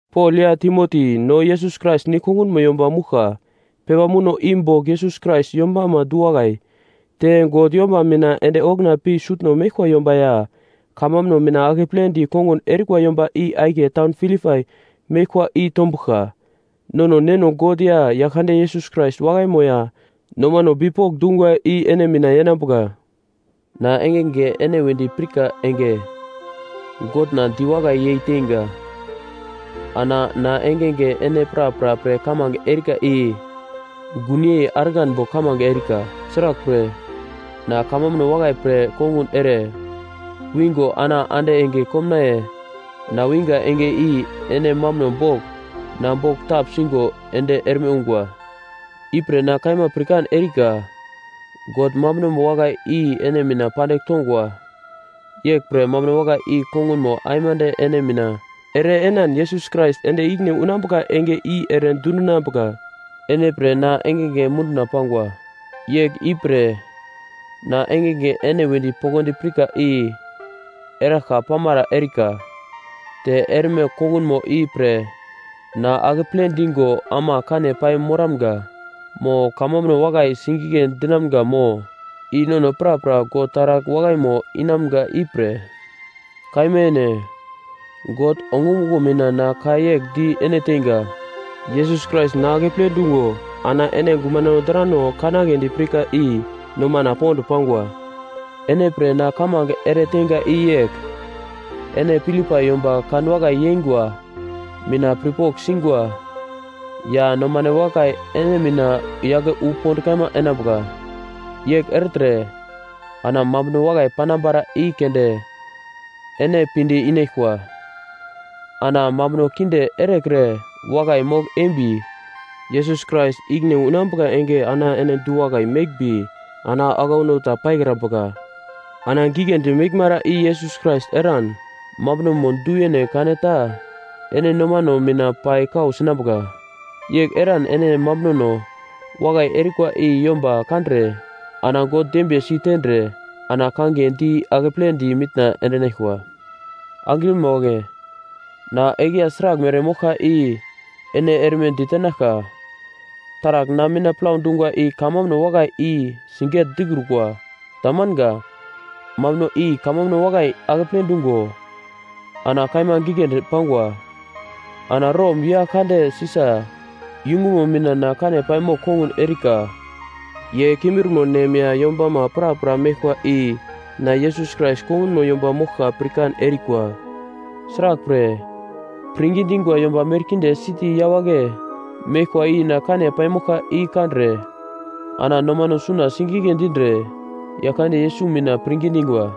Pol ya Timoti no, Yesus Krais nigl kongunmo yomba mouglka, pepa muno i bogl Yesus Krais yombama du-wakai, te God yomba mina ende okuna pi sutno meglkwa yomba ya kamambuno mina akepledi kongun erikwa yomba i akiye taun Filipai meglkwa i tombuglka. Nono Neno God ya Yaglkande Yesus Krais wakaimo ya nomano bipok dungwa i ene mina yenambuka. Na engenge ene wedi pirka enge Godna diwakai yei teinga. Ana na engenge ene prapra pre kamange erika i gunyei argan bogl kamange erika, sraglpre, na kamambuno wakai pre kongun ere wingo ana ande enge komnaiye na winga enge i ene mambuno bogl na bogl tapsingo ende erme ungwa. Ipre na kaima pirkan erika, God mambunomo wakai i ene mina pandigl tongwa, yeglpre, mambuno wakai i kongunmo aimande ene mina ere enan Yesus Krais ende ikine unambuka enge i ere dundinambuka. Ene pre na engenge munduna pangwa! Yegl i pre na engenge ene wedi poglodi pirka i eraglka pamara erika. Te erme kongunmo i pre na akeple digo ama kane pai moramga mo kamambuno wakai sigigle dinamga mo i nono prapra God taragl wakaimo inamga ipre. Kaima yene, God ongumuglo mina na ka yegl di ene teinga, Yesus Krais na akeple dungo ana ene gumano drano kanagledi pirka i nomana pond pangwa. Ene pre na kamange ere teinga i yegl, ene Filipai yomba kanwakai yeingwa mina pirpogl singwa ya nomane wakai ene mina yake wu pond kaima enambuka. Yegl ertre, ana mambuno wakai panambara i keunde ene pinde inaglkwa, ana mambuno kinde erekre wakai mogl eimbi, Yesus Krais ikine unambuka enge ana ene du-wakai meglmbi ana aglauno ta paikrambuka. Ana giglendi meglmara i Yesus Krais eran mambunomo du-yene kaneta ene nomano mina pai kau sinambuka, yegl eran ene mambunono wakai erikwa i yomba kandre ana God dembiye si tendre ana kangiye di akepledi mitna endinaglkwa. Angrima wagle, na eglya sraglmere moglka i ene erme ditenaglka. Taragl na mina plau dungwa i kamambuno wakai i siget-dikrukwa. Tamanga. Mambuno i kamambuno wakai akeple dungo ana kaima giglendi pangwa. Ana Rom yagl kande Sisa yungumo mina na kane paimogl kongun erika. Ye kimbirmo nem ya yombama prapra meglkwa i na Yesus Krais kongunmo yomba moglkwa pirkan erikwa. Sraglpre, pirngi dingwa yomba merkinde siti yawagle meglkwa i na kane paimoglka i kandre, ana nomano suna sigigle dindre Yaglkande Yesus mina pirngi dingwa.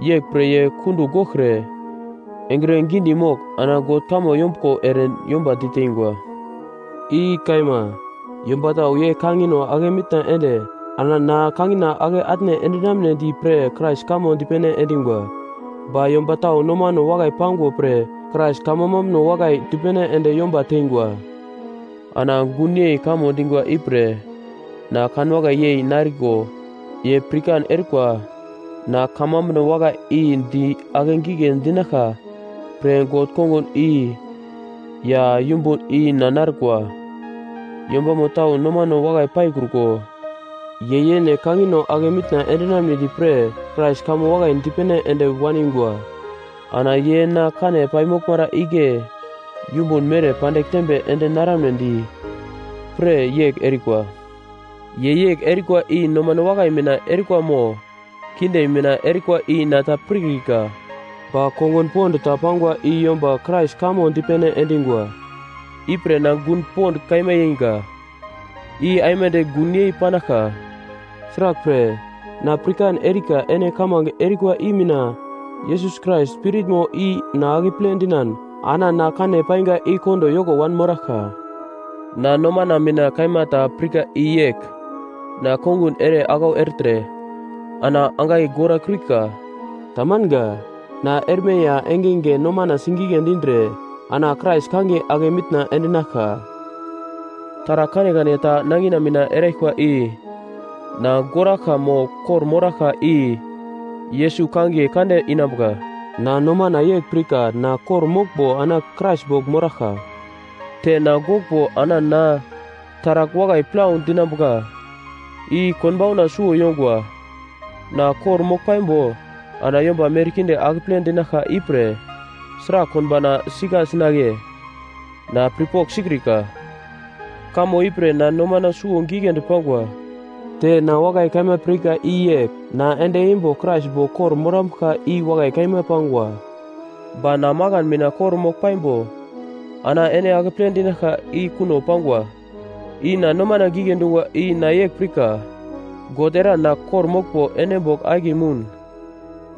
Yeglpre ye kundugl goglkre engre gidi mogl, ana God kamo yombuglo ere yomba diteingwa. I kaima. Yomba tau ye kangino ake mitna ende ana na kangina ake atne endinamnedi pre Krais kamo dipene endingwa. Ba yomba tau nomano wakai pangwa pre Krais kamambuno wakai dipene ende yomba teingwa. Ana gunyei kamo dingwa ipre na kanwakai yei nariko ye pirkan erikwa na kamambuno wakai i di akegigle dinaglka pre God kongun i ya yumbun i na narkwa. Yombamo tau nomano wakai paikruko, ye yene kangino ake mitna endinamnedi pre Krais kamo wakai dipene ende waningwa, ana ye na kane paimoglmara igle yumbun mere pandigl tembe ende naramnedi pre yegl erikwa. Ye yegl erikwa i nomano wakai mina erikwa mo kinde mina erikwa i na ta pirkrika, ba kongun pond ta pangwa i yomba Krais kamo dipene endingwa. Ipre na gun pond kaima yeinga. I aimande gun yei panaglka, sraglpre, na pirkan erika ene kamange erikwa i mina Yesus Krais Spiritmo i na akeple dinan ana na kane painga i kondo yoko wanmoraglka. Na nomana mina kaima ta pirka i yegl, na kongun ere aglau ertre ana angai gora kiurika. Tamanga. Na erme ya engenge nomana sigigle dindre ana Krais kangiye ake mitna endinaglka. Taragl kanekane ta nangina mina eraglkwa i na goraglka mo kor-moraglka i Yesus kangiye kande inambuka. Na nomana yegl pirka na kor-moglmbo ana Krais bogl moraglka, te na goglmbo ana na taragl wakai plau dinambuka. I konbauna suwo yongwa. Na kor-mogl paimbo, ana yomba merkinde akeple dinaglka ipre sragl konbauna sika sinagle? Na pirpogl sikrika. Kamo ipre na nomana suwo giglendi pangwa. Te na wakai kaima pirka i yegl na ende eimbo Krais bogl kor-morambuglka, i wakai kaima pangwa. Ba na makan mina kor mogl paimbo ana ene akeple dinaglka i kuno pangwa. I na nomana gigle dungwa i na yegl pirka, God eran na kor-moglmbo ene bogl akiye moun,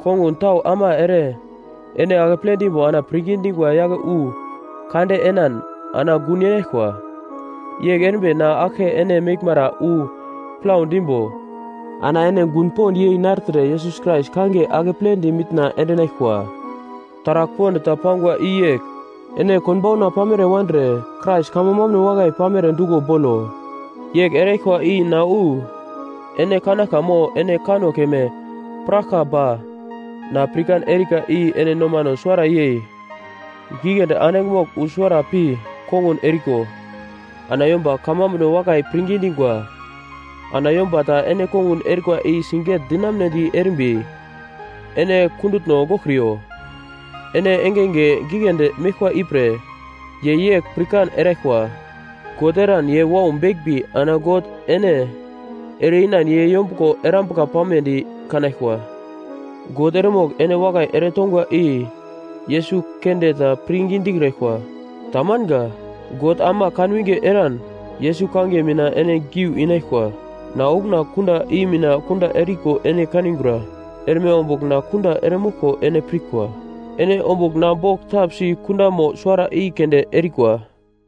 kongun tau ama ere ene akeple dimbo ana pirngi dingwa yake wu kande enan ana gun yenaglkwa. Yegl erimbi na aglke ene meglmara wu plau dimbo, ana ene gun pond yei nartre Yesus Krais kangiye akepledi mitna endinaglkwa. Taragl pond ta pangwa i yegl, ene konbauna pamere wandre Krais kamo mambuno wakai pamere duglo bolo. Yegl eraglkwa i na wu ene kanaglka mo ene kanno keme piraglka ba na pirkan erika i ene nomano suwara yei giglendi andigl mogl wu suwara pi kongun eriko, ana yomba kamambuno wakai pirngi dingwa. Ana yomba ta ene kongun erikwa i siget-dinamunedi erimbi ene kundutno goglkriyo, ene engenge giglendi meglkwa ipre ye yegl pirkan eraglkwa, God eran ye wau beglmbi ana God ene ere-inan ye yombuglo erambuka pamedi kanaglkwa. God eremogl ene wakai ere tongwa i Yesus keunde ta pirngi dikraglkwa. Tamanga. God ama kan winge eran Yesus kangiye mina ene giu inaglkwa. Na okuna kunda i mina kunda eriko ene kanigura, erme ombugl na kunda eremoglko ene pirkwa. Ene ombugl na bogl tapsi kundamo suwara i keunde erikwa.